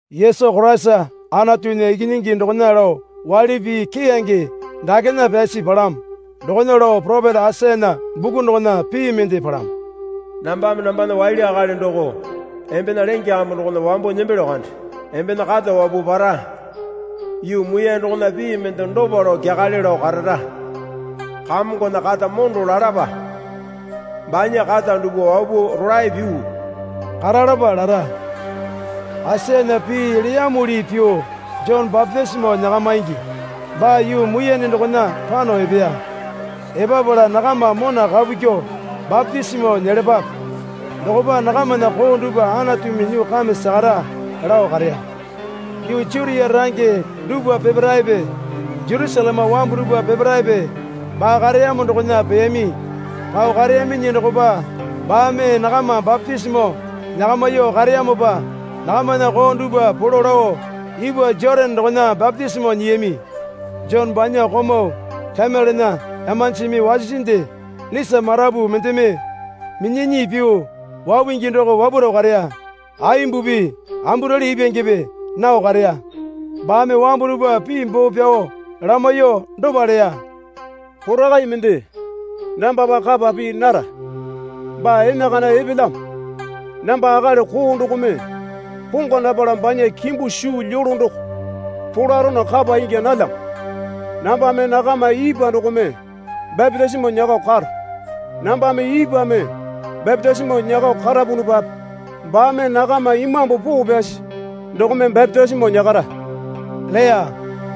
Yesu Koraisa Anatunya Ikinyingi dokona lao waili pii keyange dakena pyasi palamo. Dokona lao poropeta Aisayana buku dokona pii mende palamo. Nambame nambana waili akali doko embena lenge kambu dokona wambo nembelyo kande. Embena kata wapuo para. Yuu muiyane dokona pii mende dopa lao kyakale lao karara. Kamongona kata mondo lalapa, banya kata dupwa wapuo rolae pyuo karalapa lara. Aisayana pii leyamuli pyuo Jone bapitisimo nyakamaingi baa yuu muiyane dokona pano epeya. Epapala, Nakama mona kapu kyuo bapitisimo nyelapape, dokopa nakamana koo dupwa Anatumi nyuo kame sakara, lao kareya. Yuu Jutia range dupwa peparaepe Jerusaleme wambu dupwa peparaepe baa kareyamo dokona peyami. Pao kareyaminyi dokopa baame nakama bapitisimo nyakamyuo kareyamopa nakamana koo dupwa polo lao ipwa Jotane dokona bapitisimo nyiyami. Jone banya komau kamelena imanjimi wasisinde lisa marapu mendeme minyanyi pyuo wapungi doko wapuro kareya. Aimbupi amburali ipwangepe nao kareya. Baame wambu dupwa pii boo pyao lamaiyuo dopa leya. Porakai mende nambapa kapa pii nara baa enakana epelyamo. Namba akali koo dokome pongwa napala banya kimbu suu lyolo doko polarono kapa ingya nalyamo. Nambame nakama ipwa dokome bapitisimo nyakao karo. Nambame ipwame bapitisimo nyakao karapunupape baame nakama Imambu Poo Pyasi dokome bapitisimo nyakara, leya.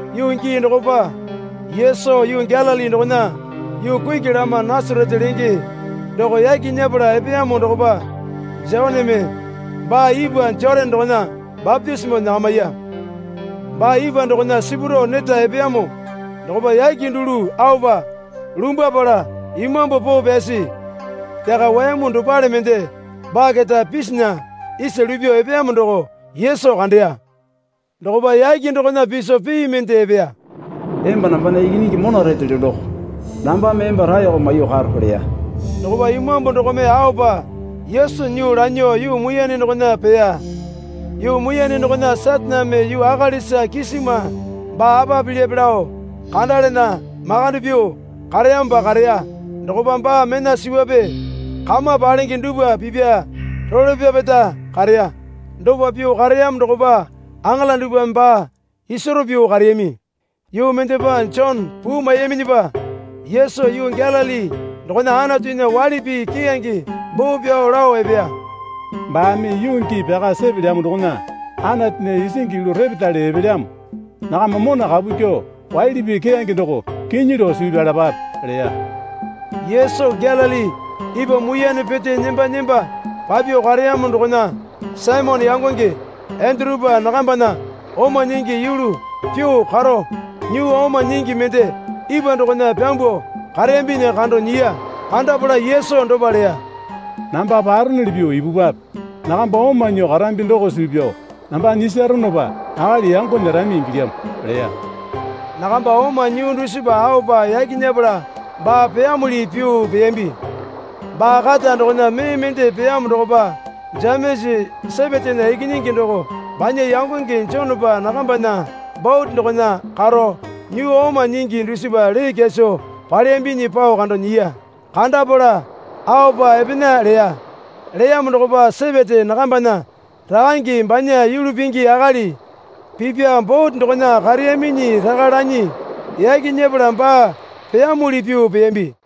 Yuu gii dokopa Yesu yuu Galili dokona yuu kuki lama Nasarete lenge doko yaki nyepala epeyamo dokopa Joneme baa ipwa Jotane dokona bapitisimo nyakamiya. Baa ipwa dokona sipurao neta epeyamo dokopa yake dulu aopa lumbwapala Imambu Poo Pyasi yaka wayamu dopale mende baa keta pisinya isa lupyuo epeyamo doko Yesu kandeya. Dokopa yake dokona piso pii mende epeya. Emba nambana Ikinyingi mona retelyo doko. Nambame emba raeko maiyuo karo, leya. Dokopa Imambu dokome aopa Yesu nyuo lanyuo yuu muiyane dokona peya. Yuu muiyane dokona Sataneme yuu akalisa kisima baa apa pilyape lao kandalana makande pyuo kareyamopa kareya. Dokopa baa mena suwape kama palenge dupwa pipya role pyapeta kareya. Dopa pyuo kareyamo dokopa aŋala dupwame baa isaro pyuo kareyami. Yuu mendepa Jone puu maiyaminyipa Yesu yuu Galili dokona Anatunya waili pii keyange boo pyao lao epeya. Baame yuu gii pyaka sepelyamo dokona Anatunya isingi yulu repetale epelyamo. Nakama mona kapu kyuo waili pii keyange doko kinyi lao suu pyalapape, leya. Yesu Galili ipwa muiyane pete nemba nemba papyuo kareyamo dokona Saimone yangonge Endurupa nakambana oma nyingi yulu pyuo karo nyuu oma nyingi mende ipwa dokona pyambuo kareyambinyi kando nyiya. Kandapala Yesu dopa leya. Namba paronuli pyuo ipupwape. Nakamba oma nyuo karambi doko suu pyao namba nyisaronopa akali yango nyerami ingilyamo, leya. Nakamba oma nyuu dusipa aopa yaki nyepala baa peyamuli pyuo peyambi. Baa kata dokona mee mende peyamo dokopa Jemesa Sepetena ikinyingi doko banya yangonge Jonepa nakambana bote dokona karo nyuu oma nyingi dusipa lee kyaso paleyambinyi pao kando nyiya. Kandapala aopa epena leya. Leyamo dokopa Sepete nakambana rakange banya yulu pingi akali pipwa bote dokona kareyaminyi raka lanyi yaki nyepala baa peyamuli pyuo peyambi.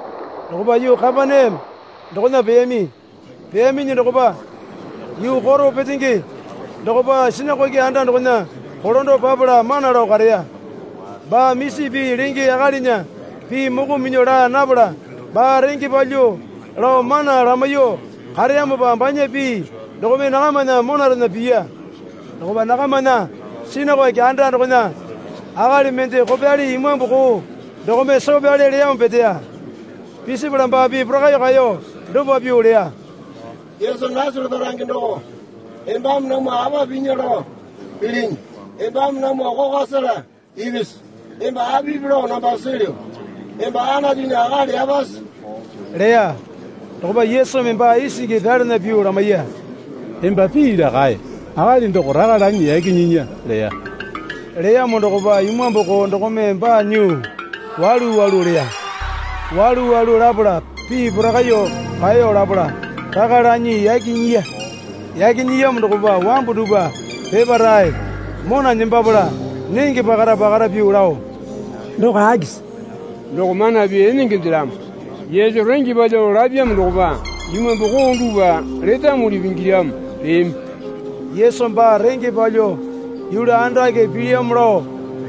Dokopa yuu Kapaneame dokona peyami. Peyaminyi dokopa yuu koro petenge dokopa sinakoke anda dokona kolando papala mana lao kareya. Baa misi pii lenge akalinya pii moko minyuo laa napala baa renge palyuo lao mana lamaiyuo kareyamopa banya pii dokome nakamana monarena piya. Dokopa nakamana sinakoke anda dokona akali mende kopyali imambu koo dokome soo pyale leyamo peteya. Pisipala baa pii porakaiyuo kaeyo dopa pyuo leya. Yesu Nasarete range doko embame namwa apa pinya lao pilinyi? Embame namwa kokwa sela ipisi? Emba apipi lao namba silyu. Emba Anatunya akali yapasi, leya. Dokopa Yesumi baa isingi pyalana pyuo lamaiya. Emba pii laa kae. Akali doko raka lanyi yaki nyinya leya. Leyamo dokopa imambu koo dokome baa nyuo walu walu leya. Walu walu lapala pii porakaiyuo kaeyo lapala raka lanyi yaki nyiya. Yaki nyiyamo dokopa wambu dupwa peparae mona nembapala nenge pakara pakara pyuo lao, Doko akisi? Doko mana pii enengendelamo. Yesu renge palyuo lapyamo dokopa imambu koo dupwa letamuli pingilamo, leyami. Yesu baa renge palyuo yulu andake pilyamo lao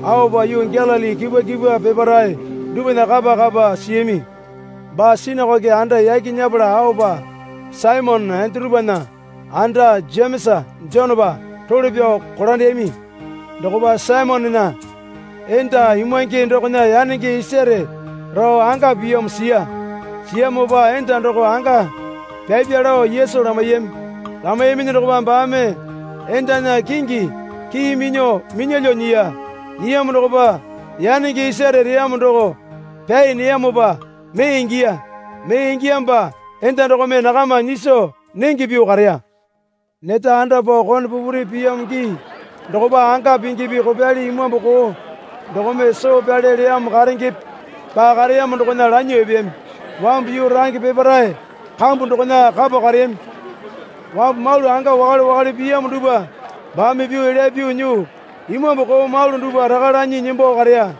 aopa yuu Galili kipwa kipwa peparae dupwana kapa kapa siyami. Baa sinakoke anda yaki nyepala aopa Saimone Endurupana anda Jemesa Jonepa role pyao kolandeyami. Dokopa Saimonena enda imwange dokona yanenge isaro rao anga piyamo siya. Siyamopa, Enda doko anga pyapya, lao Yesu lamaiyami. Lamaiyaminyi dokopa baame endana kingi kii minyuo minyalyuo nyiya. Nyiyamo dokopa yanenge isare reyamo doko pyai neyamopa mee ingiya. Mee ingiyamopa enda dokome nakama nyiso nenge pyuo kareya. Neta anda pao kone pupuri piyamo gii dokopa anga pingipi kopyali imambu koo dokome soo pyale leyamo karengepe baa kareyamo dokona lanyuo epeyami. Wambu yuu range peparae kambu dokona kapo kareyami. Wambu malu anga wakale wakale piyamo dupwa baame pyuo elya pyuo nyuo imambu koo malu dupwa raka lanyi nembo kareya.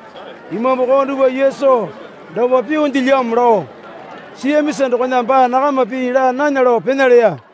Imambu koo dupwa Yesu dopa pyuondelyamo lao siyamisa dokona baa nakama pii laa nana lao pena leya.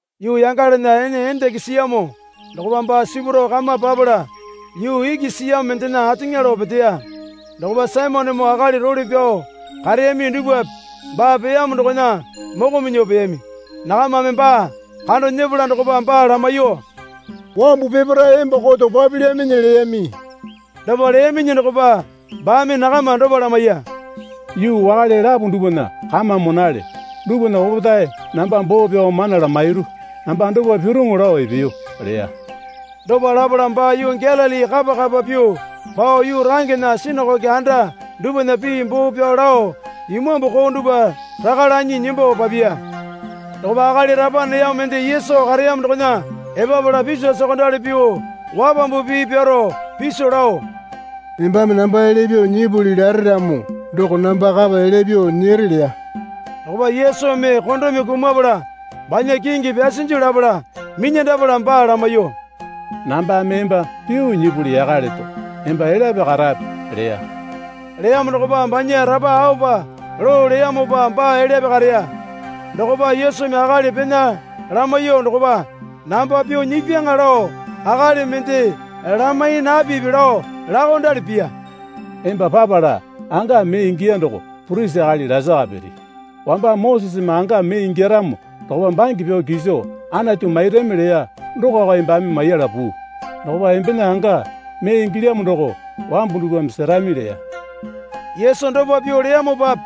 Yuu yangalana ene endenge siyamo dokopa baa sipurao kama papala yuu iki siyamo mendena ateŋa lao peteya. Dokopa Saimonemoo akali role pyao kareyami dupwape baa peyamo dokona moko minyuo peyami. Nakamame baa kando nyepala dokopa baa lamaiyuo, Wambu peparae emba koto papilyaminyi, leyami. Dopa leyaminyi dokopa baame nakama dopa lamaiya. Yuu wakale lapo dupwana kama monale. Dupwana opetae namba boo pyao mana lamairu. Namba dopa piruŋu lao epeyo, leya. Dopa lapala baa yuu Galili kapa kapa pyuo pao yuu rangena sinakoke anda dupwana pii boo pyao lao imambu koo dupwa raka lanyi nembo papiya. Dokopa akali rapa neyamo mende Yesu kareyamo dokona epapala piso sokondali pyuo wapambu pii pyaro piso lao, Embame namba elya pyuo nyipuli lare ramo doko namba kapa elya pyuo nyere leya. Dokopa Yesumi kondome kumapala banya kingi pyasinju lapala minyandapala baa lamaiyuo, Nambame emba pyuo nyipuli yaka leto. Emba elyape karape, leya. Leyamo dokopa banya rapa aopa loo leyamopa baa elyape kareya. Dokopa Yesumi akali pena lamaiyuo dokopa, Namba pyuo nyipyaŋa lao akali mende lamai napipi lao laokondali piya. Emba papala anga mee ingiya doko purisi akali lasaka piri. Wamba Moseseme anga mee ingyaramo dokopa bange pyao kiso Anatu mairami leya dokoko embame maiyala puu. Dokopa embena anga mee ingilyamo doko wambu dupwa serami leya. Yesu dopa pyuo leyamopape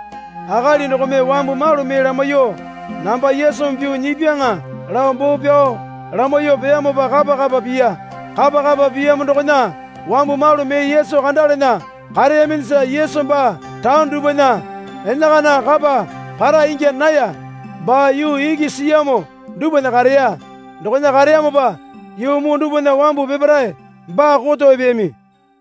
akali dokome wambu malu mee lamaiyuo, Namba Yesumi pyuo nyipyaŋa, lao boo pyao lamaiyuo peyamopa kapa kapa piya. Kapa kapa piyamo dokona wambu malu mee Yesu kandalana kareyaminyisa Yesu baa taone dupwana enakana kapa para ingya naya. Baa yuu iki siyamo dupwana kareya. Dokona kareyamopa yuu muu dupwana wambu peparae baa koto epeyami.